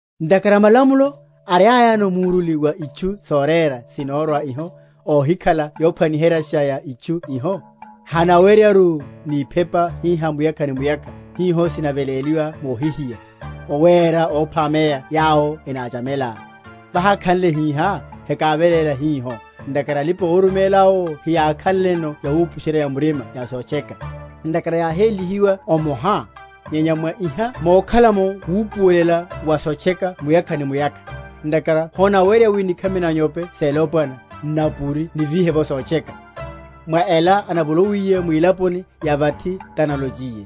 Ntakhara malamulo, ariayano muruli wa itchu sorera sinorwa iho, óhikhala yophwaniheryasha ya itchu iho, hanaweryaru, ni iphepa hiha muyakha ni muyakha, hiho sinaveléliwa mohihiya, owéra óphameya yawo enáchamela. Vahákhanle hihá, hekáveléla hiho, ntakhara alipa‐oruméláwo heyakakhanleno yawupusherya‐ya‐murima ya sotcheka, ntakhara yáhélihiwa omoha? Nyenya mwa iha mokhala’mo wupuwelela wa sotcheka muyakha ni muyakha. Ntakhara honaweryeya wi nikhami na’nyope selopwana, nnapuri nivíhe’vo sotcheka. Mwa ela anavolowiye mwilaponi ya vathi, tanalochiye,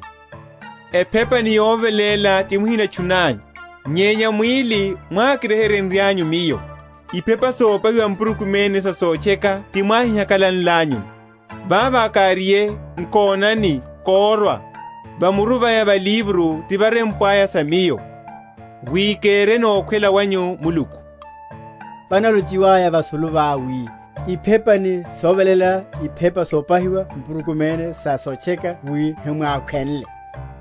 Ephepa ni yoveléla ti muhinatchunanyu, Nyenya mwíli mwákiryeheryenlanyu Miyo. Iphepa sopahiwa mpurukumene sa sotcheka ti mwáhihakalanlanyuno; Vavo káriye, Nkonani, kórwa, (Va muru vaya va livro tivarempwaya sa Miyo), Wi kereno okhwela wanyu, Muluku. Vanalochiwaya vasulu va, wi, Iphepa ni soveléla ni iphepa sopahiwa mpurukumene sa sotcheka wi himwákhwenle,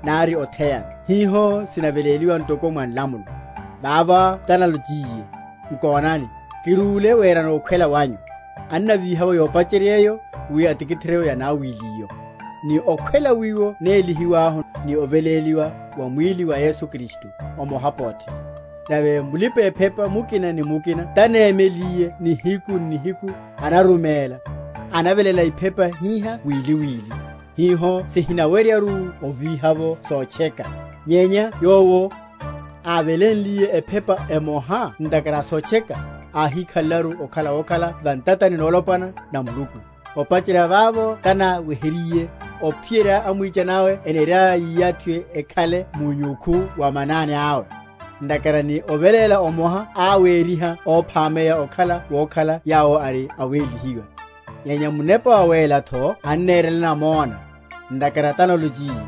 nari otheyano (hiho sinaveléliwa ntoko mwa nlamulo), vavo talonchiye, Nkonani, kirúle werano okhwela wanyu. Anavíha’vo yopacheryéyo, wi atikitherye yanawilíyo. Ni okhwela wiwo nélihiwahu ni oveléliwa wa mwíli wa Yesu Kristu, omoha, pothe. Nave mulipa‐ephepa mukina ni mukina tanémeliye nihiku n’nihiku, anaruméla, anaveléla iphepa hiha wili wili, hiho sihinaweryaru ovíha’vo sotcheka; nyenya Yowo, ávelénliye ephepa emoha ntakhara sotcheka, áhíkhalelaru okhala wokhala va ntatani nolopwana na Muluku; opacherya vavo tanaweheryiye, ophiyerya amwichani awe eniriaya yiyathiwe ekhale munyukhu wa manani awe. Ntakhara ni oveléla omoha áwériha óphameya okhala wokhala yawo ari awélihiwa. Nyenya Munepa Wawélatho annanerela namona; ntakhara tálonchiye,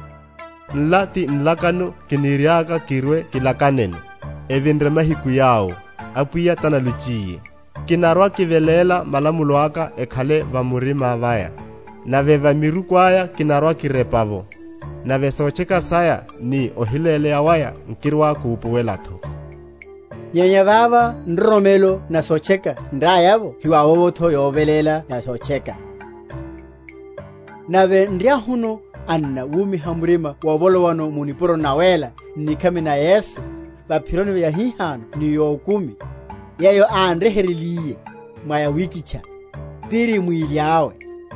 Nla ti nlakano kiniriaka kirwe‐kilakaneno, Evinre mahiku yawo, Apwiya tanalochiye; Kinarwa‐kiveléla malamulo aka ekhale va murima vaya; Nave va miruku aya kinarwa‐kirepela’vo; Nave sotcheka saya ni ohiléleya waya nkirwa‐kupuwelatho. Nyenya vavo nroromelo na sotcheka nriaya’vo hivavovotho yoveléla ya sotcheka. Elipe mu nroromelo. Nave nriahuno, anna, wumiha murima wovolowano mu nipuroni nawéla, n’nikhami na Yesu, va’phironi yahihano ni yokumi, yeyo ánryeheryenliye, mwa yawikitcha, tiri mwíli awe;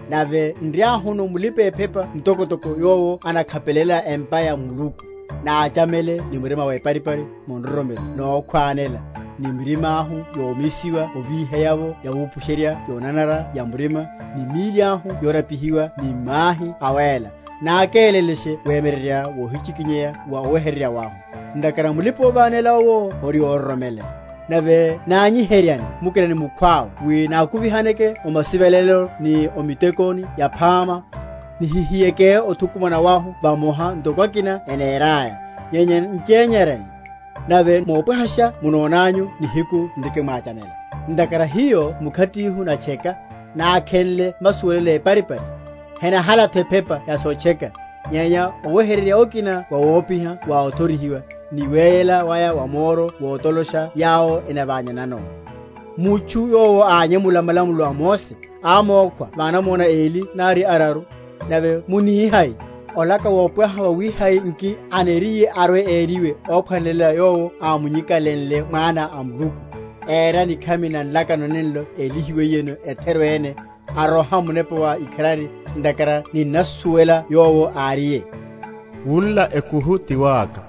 nave nriahuno mulipa‐ephepa mtokotoko yowo anakhapelela empa ya Muluku; náchamele ni murima weparipari mu nroromelo nokhwánela, ni mirimáhu yomisiwa ovíherya’vo yawupusherya yonanara‐ya‐murima, ni míli ahu yorapihiwa ni mahi awéla; nákélelashe wemyeryerya wohichikinyeya wa oweheryerya wahu, ntakhara mulipa‐ovánela owo ori óroromeleya; nave nanyiheryane mukina ni mukhwawe wi nákuvihaneke o masivelelo ni o mitekoni yaphama, nihihiyeke othukumana wahu vamoha, ntoko akina enéraya, nyenya nchenyeryane, nave mopwahasha munonanyu nihiku nrikimwachamela. Ntakhara hiyo mkhatihu natcheka, nákhenle masuwelelo éparipari, henahalatho ephepa ya sotcheka, nyenya oweheryerya okina wawopiha wa othorihiwa, ni weyela waya wa moro wotolosha yawo enaványanano. Mutchu yowo ányemula malamulo a Mose, ámókhwa va anamona eli nari araru: nave munihai, olaka wopwaha wawihai nki aniriye arwe‐eriwe óphwanelela yowo ámunyikalenle Mwana a Muluku, éra nikhami na nlakano nenlo élihiwiyeno, etheru ene, aroha Munepa wa ikharari; ntakhara ninnamusuwela Yowo áriye, Wunla ekuhu ti waka,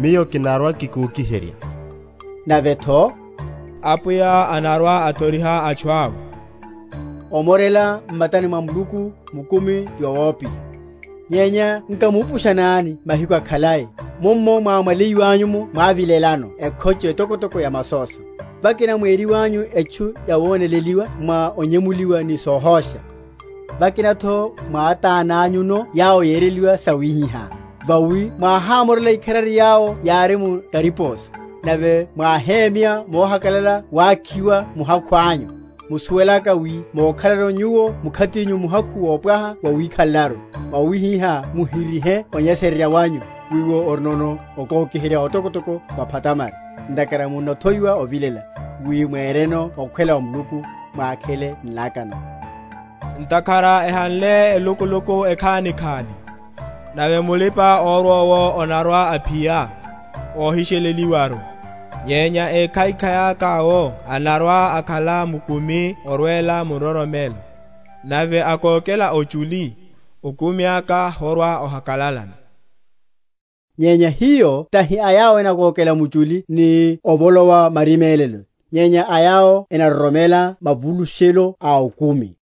Miyo kinarwa‐kikokiherya. Navetho Apwiya anarwa‐athoriha atchu awe. Omorela m’matani mwa Muluku mukumi ti wawopiha. Nyenya nkamupushanani mahiku akhalai, mummo mwámwaleiwanyu’mo mwávilelano ekhocho etokotoko ya masóso; vakina mwériwanyu etchu yawoneleliwa mwa onyemuliwa ni sohósha; vakinatho mwátánányuno yawo yereliwa sawihiha. Vawi mwáhámorela ikharari yawo yári mu kariposo, nave mwáhémya mohakalala wakhiwa muhakhu anyu, musuwelaka wi mokhalano nyuwo mkhatinyu muhakhu wopwaha wawikhalelaru. Mwawihihá muhirihe onyesererya wanyu, wiwo orinono okokiherya otokotoko wa phatamari. Ntakhara munnathowiwa ovilela, wi mwenreno okhwela wa Muluku, mwákhele nlakano. Ntakhara ehanle elukuluku ekhanikhani, Nave mulipa‐orwa owo anarwa‐aphiya, ahisheleliwaru. Nyenya ékhaikhai aka owo anarwa‐akhala mukumi orwela mu nroromelo: Nave akókela ochuli, okumi aka horwa‐ohakalalano. Nyenya hiyo tahi a yawo enakókela muchuli ni ovolowa marimélelo; nyenya a yawo enaroromela mavulushelo a okumi.